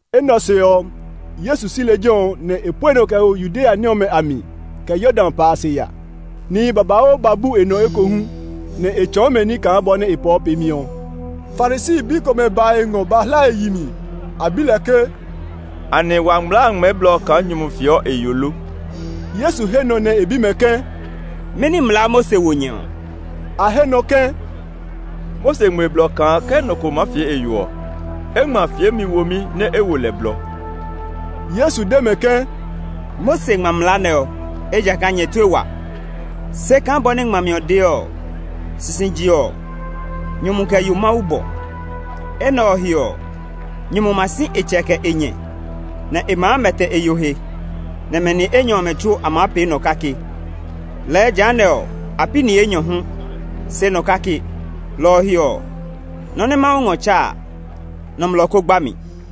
Enɛ ɔ se ɔ, Yesu si lejɛ ɔ, nɛ e pue nɔ kɛ ho Yudea ní ɔmɛ a mi, kɛ Yordan pa a se ya. Nihi babauu ba bu e nɔ ekohu, nɛ e tsɔɔ mɛ ní kaa bɔ nɛ e pɔɔ peemi ɔ. Farisi bi komɛ ba e ngɔ ba hla e yi mi. A bi lɛ ke, “Anɛ wa mlaa a ngmɛɛ blɔ kaa nyumu fieɔ e yo lo?” Yesu he nɔ nɛ e bi mɛ ke, “Mɛni mlaa Mose wo nyɛ ɔ?” A he nɔ ke, “Mose ngmɛ blɔ kaa ke nɔ ko maa fie e yo ɔ, e ngma fiemi womi, nɛ e wo lɛ blɔ.” Yesu de mɛ ke, “Mose ngma mlaa nɛ ɔ, ejakaa nyɛ tue wa. Se kaa bɔ nɛ ngmami ɔ de ɔ, ‘Sisije ɔ, nyumu kɛ yo Mawu bɔ. Enɛ ɔ he ɔ, nyumu ma si e tsɛ kɛ e nyɛ, nɛ e maa mɛtɛ e yo he, nɛ mɛ ni enyɔ ɔmɛ tsuo a maa pee nɔ kake.’ Lɛɛ jehanɛ ɔ, a pi ni enyɔ hu, se nɔ kake. Lɔ ɔ he ɔ, nɔ́ nɛ Mawu ngɔ tsa a, nɔmlɔ kó gba mi.”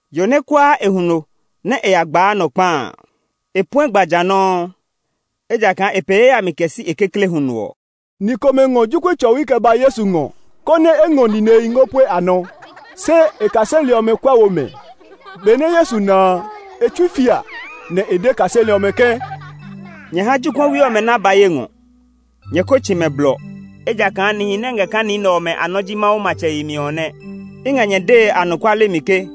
Yo nɛ kuaa e huno nɛ e ya gbaa nɔ kpa a, e puɛ gba ja nɔuu, ejakaa e pee yayami kɛ si e kekle huno ɔ.” Ni komɛ ngɔ jokuɛ tsɔwi kɛ ba Yesu ngɔ konɛ e ngɔ ninehi ngɔ pue a nɔ; se e kaseli ɔmɛ kuɛ wo mɛ. Benɛ Yesu na a, e tsui fia, nɛ e de e kaseli ɔmɛ ke, “Nyɛ ha jokuɛwi ɔmɛ nɛ a ba ye ngɔ; nyɛ ko tsi mɛ blɔ, ejakaa nihi nɛ ngɛ kaa ni nɛ ɔmɛ a nɔ ji Mawu matsɛ yemi ɔ nɛ. I ngɛ nyɛ dee anɔkuale mi ke,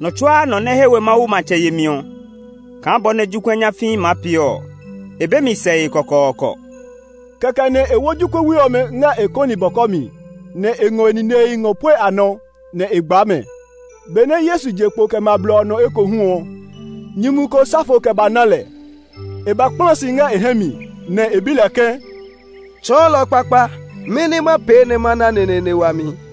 nɔ tsuaa nɔ nɛ he we Mawu matsɛ yemi ɔ kaa bɔ nɛ jokuɛ nyafii maa pee ɔ, e be mi sɛe kɔkɔɔkɔ.” Kɛkɛ nɛ e wo jokuɛwi ɔmɛ ngɛ e kɔni bɔkɔ mi, nɛ e ngɔ e ninehi ngɔ pue a nɔ, nɛ e gbaa mɛ. Benɛ Yesu je kpo kɛ ma blɔ ɔ nɔ ekohu ɔ, nyumu ko sa fo kɛ ba na lɛ. E ba kpla si ngɛ e hɛ mi, nɛ e bi lɛ ke, “Tsɔɔlɔ kpakpa, mɛni ma pee nɛ ma ná neneene wami?”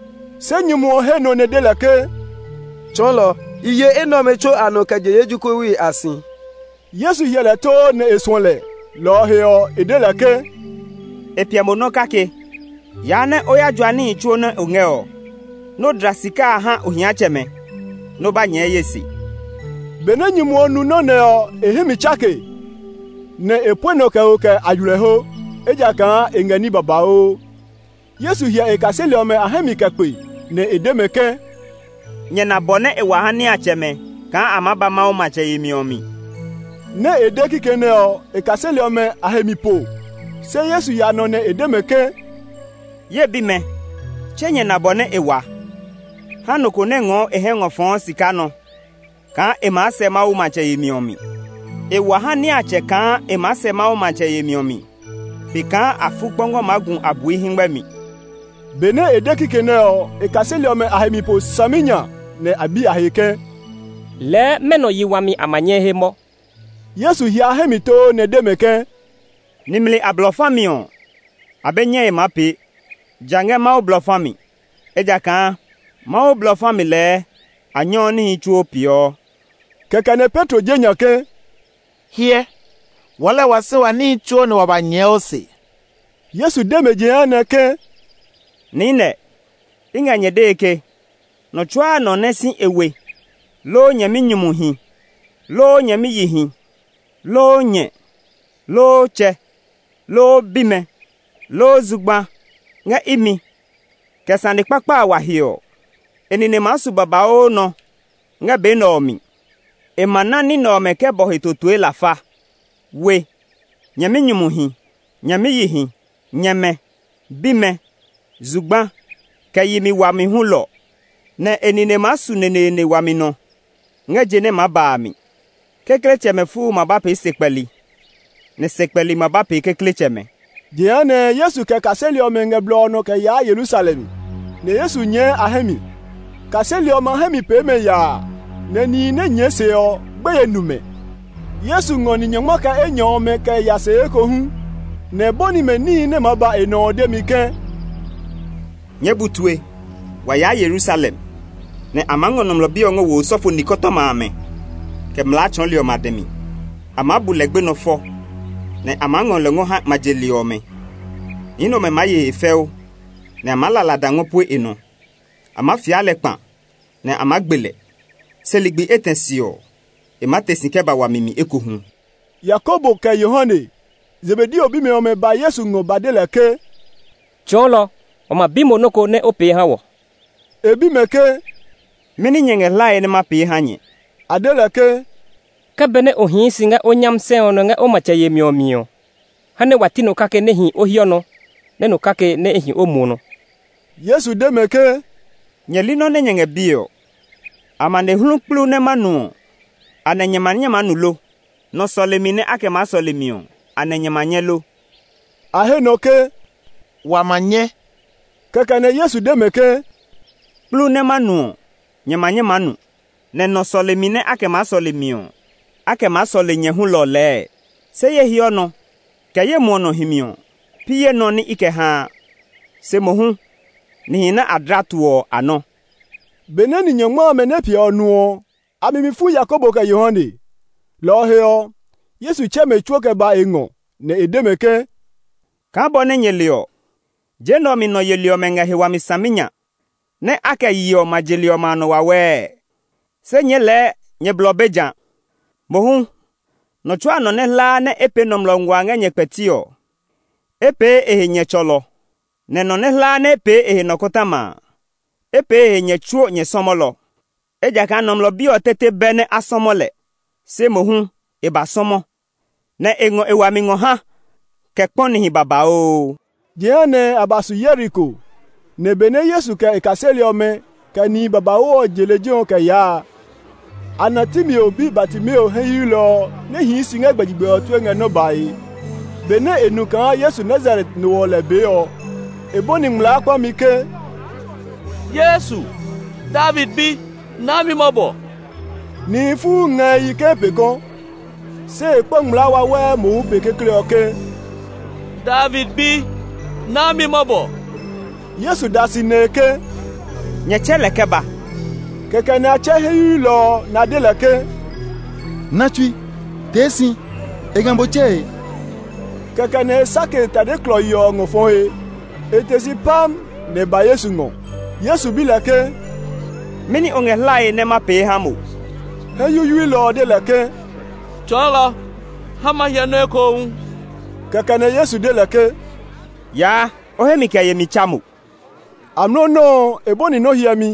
Se nyumu ɔ he nɔ nɛ e de lɛ ke, “Tsɔɔlɔ, i ye enɛ ɔmɛ tsuo a nɔ kɛ je ye jokuɛwi a si.” Yesu hyɛ lɛ too nɛ e suɔ lɛ, lɔ ɔ he ɔ, e de lɛ ke, “E piɛ mo nɔ kake. Yaa nɛ o ya jua níhi tsuo nɛ o ngɛ ɔ, nɛ o dla sika a ha ohiatsɛmɛ, nɛ o ba nyɛɛ ye se.” Benɛ nyumu ɔ nu nɔ́ nɛ ɔ, e hɛ mi tsake, nɛ e pue nɔ kɛ ho kɛ aywilɛho, ejakaa e ngɛ ní babauu. Yesu hyɛ e kaseli ɔmɛ a hɛ mi kɛ kpe, nɛ e de mɛ ke, “Nyɛ na bɔ nɛ e wa ha niatsɛmɛ kaa a maa ba Mawu matsɛ yemi ɔ mi!” Nɛ e de kikɛ nɛ ɔ, e kaseli ɔmɛ a he mi po. Se Yesu ya nɔ nɛ e de mɛ ke “Ye bimɛ, tse nyɛ na bɔ nɛ e wa ha nɔ ko nɛ ngɔɔ e hɛ ngɔ fɔɔ sika nɔ kaa e maa sɛ Mawu matsɛ yemi ɔ mi. E wa ha niatsɛ kaa e maa sɛ Mawu matsɛ yemi ɔ mi pe kaa afukpɔngɔ maa gu abui hɛngmɛ mi.” Benɛ e de kikɛ nɛ ɔ, e kaseli ɔmɛ a he mi po saminya, nɛ a bi a he ke, “Lɛɛ mɛnɔ yi wami a ma nyɛ he mɔ?” Yesu hyɛ a hɛ mi too nɛ e de mɛ ke, “Nimli a blɔ fa mi ɔ, a be nyɛe maa pee, ja ngɛ Mawu blɔ fa mi; ejakaa Mawu blɔ fa mi lɛɛ a nyɛɔ níhi tsuo peeɔ.” Kɛkɛ nɛ Petro je nya ke, “Hyɛ, wɔɔ lɛɛ wa si wa níhi tsuo nɛ wa ba nyɛɛ o se.” Yesu de mɛ jehanɛ ke, “Niinɛ i ngɛ nyɛ dee ke, nɔ tsuaa nɔ nɛ si e we, loo nyɛminyumuhi, loo nyɛmiyihi, loo nyɛ, loo tsɛ, loo bimɛ, loo zugba ngɛ imi, kɛ sane kpakpa a wa he ɔ, e nine maa su babauu nɔ ngɛ be nɛ ɔ mi. E ma na ní nɛ ɔmɛ kɛ bɔ he totoe lafa: we, nyɛminyumuhi, nyɛmiyihi, nyɛmɛ, bimɛ, zugba, kɛ yi wami hulɔ; nɛ e nine maa su neneene wami nɔ ngɛ je nɛ maa ba a mi. Kekletsɛmɛ fuu ma ba pee sekpɛli, nɛ sekpɛli ma ba pee kekletsɛmɛ.” Jehanɛ Yesu kɛ e kaseli ɔmɛ ngɛ blɔ ɔ nɔ kɛ yaa Yerusalem, nɛ Yesu nyɛɛ a hɛ mi. Kaseli ɔmɛ a hɛ mi pee mɛ yaa, nɛ nihi nɛ nyɛɛ se ɔ, gbeye nu mɛ. Yesu ngɔ ni nyɔngma kɛ enyɔ ɔmɛ kɛ ya se ekohu, nɛ e bɔni mɛ níhi nɛ maa ba e nɔ ɔ demi ke, “Nyɛɛ bu tue; wa yaa Yerusalem, nɛ a maa ngɔ Nɔmlɔ Bi ɔ ngɔ wo osɔfo nikɔtɔma amɛ, kɛ mlaa tsɔɔli ɔmɛ a dɛ mi. A maa bu lɛ gbenɔ fɔ, nɛ a maa ngɔ lɛ ngɔ ha ma je li ɔmɛ. Ni nɛ ɔmɛ maa ye e he fɛu, nɛ a maa la lada ngɔ pue e nɔ. A maa fia lɛ kplibi, nɛ a maa gbe lɛ; se ligbi etɛ se ɔ, e maa te si kɛ ba wami mi ekohu.” Yakobo kɛ Yohane, Zebedeo bimɛ ɔmɛ ba Yesu ngɔ ba de lɛ ke, “Tsɔɔlɔ, wa ma bi mo nɔ́ ko nɛ o pee ha wɔ.” E bi mɛ ke, “Mɛni nyɛ ngɛ hlae nɛ ma pee ha nyɛ?” A de lɛ ke, “Ke benɛ o hii si ngɛ o nyami sɛ ɔ nɔ ngɛ o matsɛ yemi ɔ mi ɔ, ha nɛ wa ti nɔ kake nɛ hi o hiɔ nɔ, nɛ nɔ kake nɛ hi o muɔ nɔ.” Yesu de mɛ ke, “Nyɛ li nɔ nɛ nyɛ ngɛ bie ɔ. Amanehlu kplu nɛ ma nu ɔ, anɛ nyɛ ma nyɛ nu lo? Nɔ sɔlemi nɛ a kɛ maa sɔle mi ɔ, anɛ nyɛ ma nyɛ lo!” A he nɔ ke, “Wa ma nyɛ.” Kɛkɛ nɛ Yesu de mɛ ke, “Kplu nɛ ma nu ɔ, nyɛ ma nyɛ maa nu, nɛ nɔ sɔlemi nɛ a kɛ maa sɔle mi ɔ, a kɛ maa sɔle nyɛ hulɔ lɛɛ, se ye hiɔ nɔ, kɛ ye muɔ nɔ himi ɔ, pi ye nɔ́ nɛ i kɛ haa, se mohu nihi nɛ a dla to ɔ a nɔ́.” Benɛ ni nyɔngma amɛ nɛ piɛ ɔ nu ɔ, a mi mi fu Yakobo kɛ Yohane. Lɔ ɔ he ɔ, Yesu tsɛ mɛ tsuo kɛ ba e ngɔ, nɛ e de mɛ ke, “Kaa bɔ nɛ nyɛ le ɔ, je nɛ ɔ mi nɔ yeli ɔmɛ ngɛ he wami saminya nɛ a kɛ yeɔ ma je li ɔmɛ a nɔ wawɛɛ. Se nyɛɛ lɛɛ nyɛ blɔ be jã. Mohu nɔ tsuaa nɔ nɛ hlaa nɛ e pee nɔmlɔ ngua ngɛ nyɛ kpɛti ɔ, e pee e he nyɛ tsɔlɔ; nɛ nɔ nɛ hlaa nɛ e pee e he nɔkɔtɔma a, e pee e he nyɛ tsuo nyɛ sɔmɔlɔ. Ejakaa Nɔmlɔ Bi ɔ tete bɛ nɛ a sɔmɔlɔ lɛ, se mohu e ba sɔmɔ, nɛ́ e ngɔ e wami ngɔ ha kɛ kpɔ nihi babauu.” Jehanɛ a ba su Yeriko, nɛ benɛ Yesu kɛ e kaseli ɔmɛ, kɛ ma kpekpemi nihi babauu je lejɛ ɔ kɛ yaa a, a na Timeo bi Bartimeo hɛ yuyuilɔ ɔ nɛ hii si ngɛ gbɛjegbɛ ɔ tue ngɛ nɔ́ bae. Benɛ e nu kaa Yesu Nazaret no ɔ lɛ bee ɔ, e bɔni ngmlaa kpami ke, “Yesu, David bi, naa mi mɔbɔ!” Nihi fuu nga e yi ke e pee kɔ. Se e kpa ngmlaa wawɛɛ mohu pe kekle ɔ ke, “David bi, naa mi mɔbɔ!” Yesu da si, nɛ e ke, “Nyɛ tsɛ lɛ kɛ ba!” Kɛkɛ nɛ a tsɛ hɛ yuyuilɔ ɔ, nɛ a de lɛ ke, “Na tsui; tee si, e ngɛ mo tsɛe!” Kɛkɛ nɛ e sake e tade klɔii ɔ ngɔ fɔ he; e te si pam; nɛ e ba Yesu ngɔ. Yesu bi lɛ ke, “Mɛni o ngɛ hlae nɛ ma pee ha mo?” Hɛ yuyuilɔ ɔ de lɛ ke, “Tsɔɔlɔ, ha ma hyɛ nɔ́ ekohu.” Kɛkɛ nɛ Yesu de lɛ ke, “Yaa, o hemi kɛ yemi tsa mo!” Amlɔ nɔuu ɔ, e bɔni nɔ́ hyɛmi,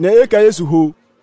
nɛ e kɛ Yesu ho.